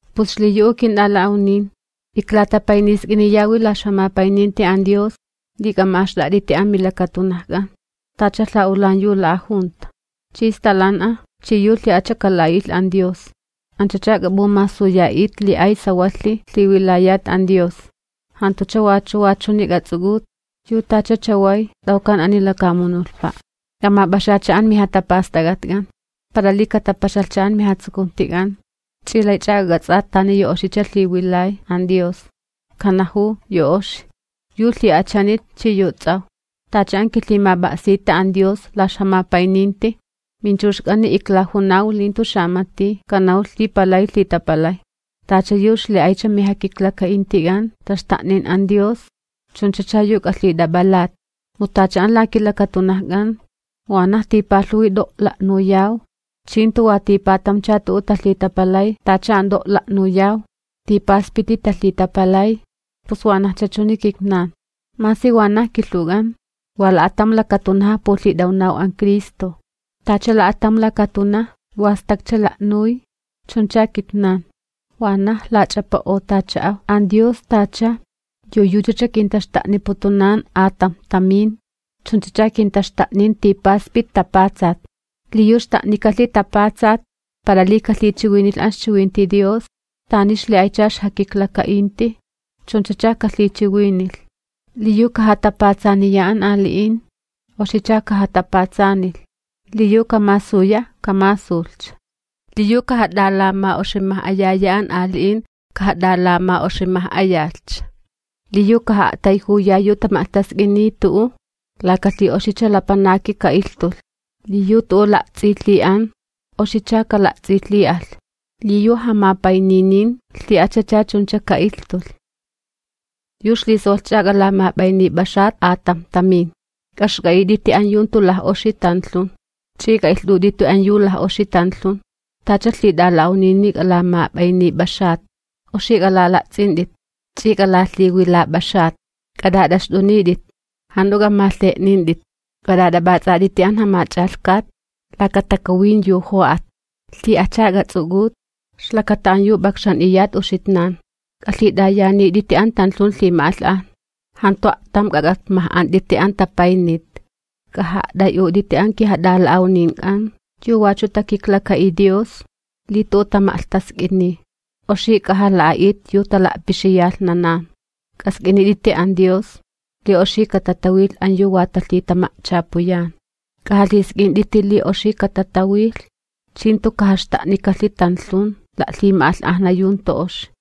Pus xliyu'u kint'ala'awnin, iklatapaynisk'iniyawi la ixjamapayninti an Dios li k'ama'axt'a't'iti amilakatunajk'an tacha lha'ulan yu la'ajunta chi stalan'a chi yu lhi'acha kala'a'ilh an Dios. Anch'ach'a k'ap'umasuya'it li ay sawalhi lhiwilayat an Dios. Jantucha wachu wa ch'uni k'ats'uk'ut yu tacha chaway t'awkan ani lakamunulhpa', k'amap'axatcha amijatapast'ak'atk'an para li katapaxalhcha amijatsukuntik'an chi laych'a k'ak'ats'at tani yu oxicha lhiwilay an Dios, kanajuw, yu oxi, yu lhi'achanit chi yu ts'awj. Tacha an kilhimap'a'sita an Dios la ixjamapayninti, minchuxk'ani iklajunaw li jantu xamati kanawlh li palay lhitapalay, tacha yu xli'aycha mijakiklaka'intik'an taxta'nin an Dios chunchacha yu k'alhit'ap'alat. Mu tacha an la kilakatunajk'an wanaj tipalhuwi t'o' la'nuyaw, chi jantu wa tipatamcha tu'u talhitapalay tacha an t'o' la'nuyaw, tipaspiti talhitapalay, pus wanajcha chuni kitnan, masi wanaj kilhuwk'an, wa la'atam lakatunaja pulhit'awnaw an Cristo, tacha la'atam lakatunaj wa stakcha la'nuy chuncha kitnan, wanaj lach'apa'otacha'aw. An Dios tacha yu yuchacha kintaxta'niputun atamjtamin, chunchacha kintaxta'nin tipaspit tapatsat. Li yu xta'nikalhi tapatsat para li kalhichiwinilh an ixchiwinti Dios, tani xli'aycha ixjakiklaka'inti chunchacha kalhichiwinilh. Li yu kajatapatsaniya an ali'in, oxicha kajatapatsanilh, li yu kamasuya, kamasulhcha. Li yu kajat'alama'oximaj'ayaya an ali'in, kajat'alama'oximaj'ayalhcha, li yu kaja'a'tayjuya yu tama'lhtask'iniy tu'u, laka lhi'oxicha lapanaki ka'ilhtulh. Li yu tu'u la'ts'ilhi'an, oxicha kala'ts'ilhi'alh, li yu jamapayninin lhi'achacha chuncha ka'ilhtulh. Yu ixlisawalhch'a k'alamap'aynip'axat atamjtamin, k'axk'a'it'iti an yu jantu laj'oxi tanlhun chi k'a'ilht'ut'iti an yu laj'oxi tanlhun. Tacha lhit'ala'awnini k'alamap'aynip'axat, oxi k'alala'ts'int'it ch'i k'alalhiwilap'axat. K'at'at'axt'unit'it, jant'u k'amalhe'nint'it, k'at'at'ap'ats'at'iti an Jamach'alhkat laka takuwin yu jo'at. Lhi'acha k'ats'uk'ut ixlakata an yu p'akxan'iyat uxitnan. K'alhit'ayanit'iti an tanlhun lhima'alh'ajna, jantu a'tam k'ak'apmaj'ant'iti an tapaynit. K'aja'a't'ay'ut'iti an kijat'ala'awnink'an yu wachu takiklaka'iy Dios li tu'u tama'lhtask'iniy, oxi k'ajala'a'it yu tala'pixiyalhnanan. K'ask'init'iti an Dios li oxi katatawilh an yu wa talhitama'chapuyan. K'ajalhisk'int'iti li oxi katatawilh chi jantu kajaxta'nikalhi tanlhun la'lhima'alh'ajna yu jantu oxi.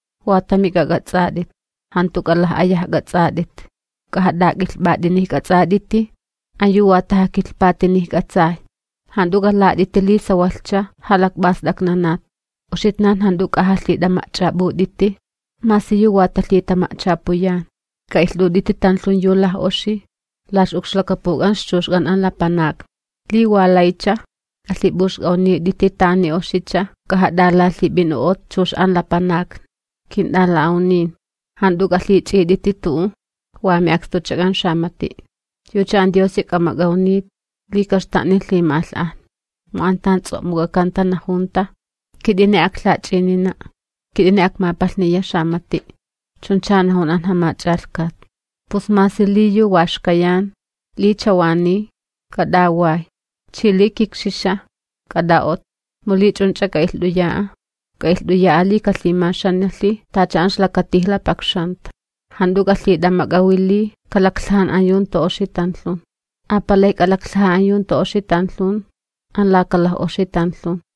Wa tami k'ak'ats'at'it. Jant'u k'alaj'ayajk'ats'at'it, k'ajat'ak'ilhp'at'inijk'ats'at'iti an yu wa tajakilhpatinijk'atsay. Jant'u k'alat'iti li sawalhcha jalakp'ast'aknanat. Uxitnan jant'u k'ajalhit'ama'ch'ap'ut'iti masi yu wa talhitama'chapuyan. K'a'ilht'ut'iti tanlhun yu laj'oxi la ix'ukxlakapuk'an ixchuxk'an an lapanakni. Li wa laycha, k'alhip'uxk'awnit'iti tani oxicha k'ajat'alalhip'in'o'ot chux an lapanakni. Kint'ala'awnin, jant'u k'alhich'it'iti tu'u wa mi'akstuchak'an xamati', yucha an Diosi k'amak'awnit li kaxta'nilh lhima'alh'ajna. Mu an tan ts'o'muk'akanta najunta: “Kit'ini aklhach'inina', kit'ini akmapalhniya xamati'.” Chuncha najun an Jamach'alhkat. Pus li masi yu wa xkayan, li chawaniy, k'at'away, chi li kikxixa, k'at'a'ott'i, mu li ch'unch'a k'a'ilht'uya'a, k'a'ilht'uya'a li kalhimaxanalhi tacha an ixlakatijla pakxanta. Jant'u k'alhit'amak'awi li kalaklhajan an yu jantu oxi tanlhun, apalij an yu jantu oxi tanlhun an laka laj'oxi tanlhun.